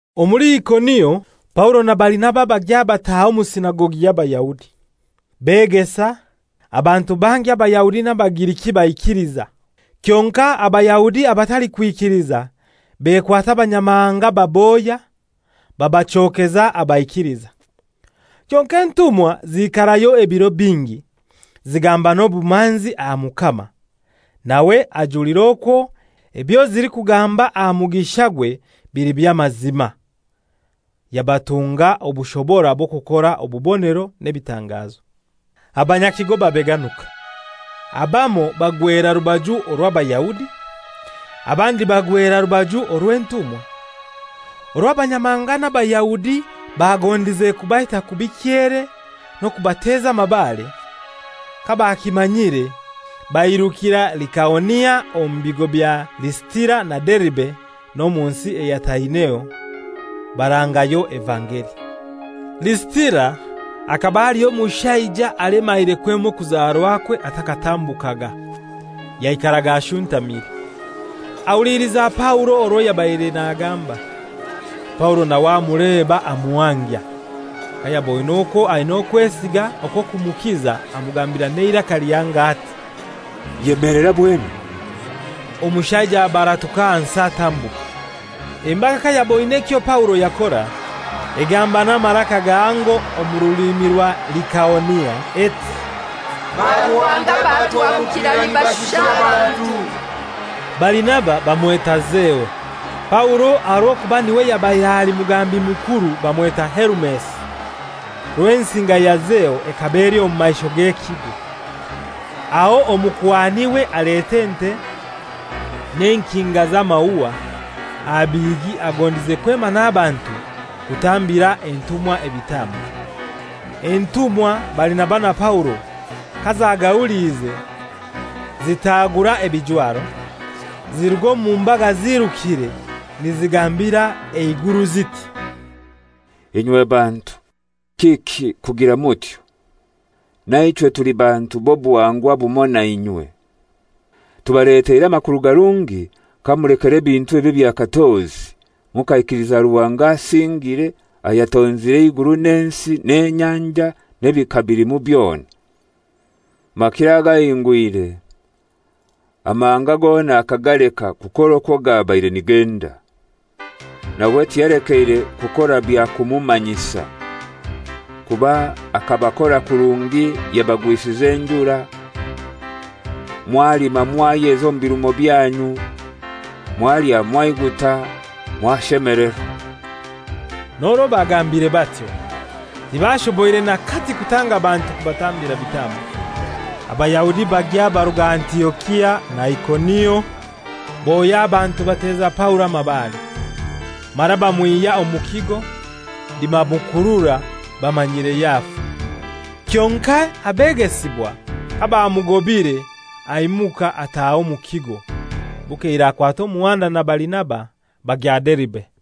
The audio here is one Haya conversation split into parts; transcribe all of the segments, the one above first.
Omuli Ikonio Paulo na Barinaba bagya bataha omu sinagogi y'Abayahudi. Begesa, abantu bangi Abayahudi n'Abagiriki baikiliza. Kyonkai Abayahudi abatalikwikiliza bekwata Abanyamahanga babohya, babachokeza abaikiliza. Kyonkai entumwa ziikarayo ebiro bingi, zigamba n'obumanzi aha Mukama, nawe ajulira okwo ebyo zilikugamba aha mugishagwe bili by'amazima; yabatunga obushobora bw'okukora obubonero n'ebitangazo. Abanyakigo babeganuka. Abamoi bagwera rubaju orw'Abayahudi, abandi bagwera rubaju orw'entumwa. Orwo Abanyamahanga n'Abayahudi bagondize kubaita kubi kyere n'okubateza amabare, kabakimanyire bairukira Likaonia omu bigo bya Lisitira na Deribe n'omu nsi eyataineho; barangayo evangeli. Lisitira hakaba haliyo omushaija, alemaire kwema okuzarwakwe atakatambukaga, yaikaraga ashuntamire. Ahuliliza Paulo orwo yabaire nagamba. Paulo nawe amuleba amuhangya. Kayaboine okwo aina okwesiga okw'okumukiza amugambira n'eiraka lihango ati, «Yemelera bwemi.» Omushaija abaratuka ahansi atambuka. Embaga kayaboine ekyo Paulo yakora, egamba n'amaraka gahango omu rulimi rwa Likaonia eti, «Baruhanga batuhabukira nibashusha abantu!» Barinaba bamweta Zeo, Paulo aha rw'okuba n'iwe yabaire ali mugambi mukuru bamweta Herumesi. Rwensinga ya Zeo ekaba eli omu maisho g'ekigo; aho omukuhan'iwe aleta ente n'enkinga z'amaua aha bihigi agondize kwema n'abantu kutambira entumwa ebitambo. Entumwa Barinaba na Paulo kazagahuliize, zitagura ebijwaro, ziruga omu mbaga ziirukire nizigambira eiguru ziti, «Inywe bantu, kiki kugira mutyo? Naichwe tuli bantu b'obuhangwa bumoi nainywe. Tubaleteire amakuru garungi kamulekera ebintu ebi ebya katozi mukaikiliza Ruhanga asingire ayatonzire eiguru n'ensi n'enyanja n'ebikabilimu byona. Makiro agahingwire amahanga gona akagaleka kukora okwo gabaire nigenda. Nawe tiyalekeire kukora bya kumumanyisa. Kuba akabakora kurungi yabagwisiza enjura, mwalima mwayeza omu birumo byanyu, mwalya mwaiguta, mwashemelerwa.» N'orwo bagambire batyo tibashoboire n'akati kutanga bantu kubatambira bitambo. Abayahudi bagya baruga Antiokia na Ikonio; bohya abantu bateza Paulo amabare, mara bamwihya omu kigo nibamukurura bamanyiire yafa. Kyonkai abegesibwa kabamugobire, aimuka ataaha omu kigo. Bukeire akwata omuhanda na Barinaba bagya Deribe.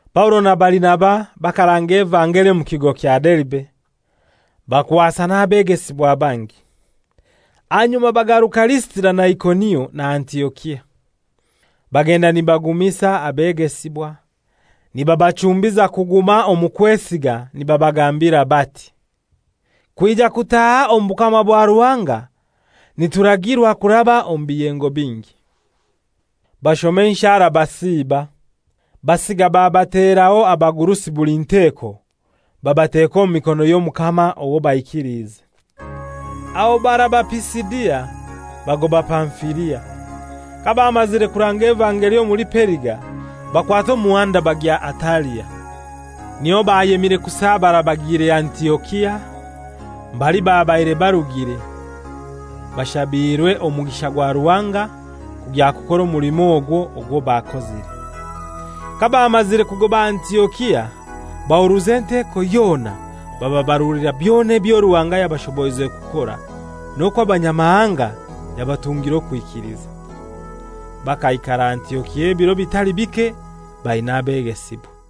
Paulo na Barinaba bakaranga evangeli omu kigo kya Deribe, bakwasa n'abegesibwa bangi. Ahanyuma bagaruka Lisitira na Ikonio na Antiokia. Bagenda nibagumisa abegesibwa, nibabachumbiza kuguma omu kwesiga nibabagambira bati, «Kwija kutaaha omu bukama bwa Ruhanga nituragirwa kuraba omu biyengo bingi.» Bashoma enshara basiiba, basiga babateraho abagurusi buli nteko, babateka omu mikono y'Omukama owo baikiliize. Aho baraba Pisidia, bagoba Pamfilia. Kabamazire kuranga evangeli omuli Periga, bakwata omuhanda bagya Atalia. Niyo bayemire kusabara bagiire Antiokia, mbali babaire barugire, bashabiirwe omugisha gwa Ruhanga kugya kukora omulimo ogwo, ogwo bakozire. Kabamazire kugoba Antiokia bahuruza enteko yona bababarulira byona ebyo Ruhanga yabashoboize kukora, n'okwo Abanyamahanga yabatungire okwikiliza. Bakaikara Antiokia ebiro bitali bike baina abegesibwa.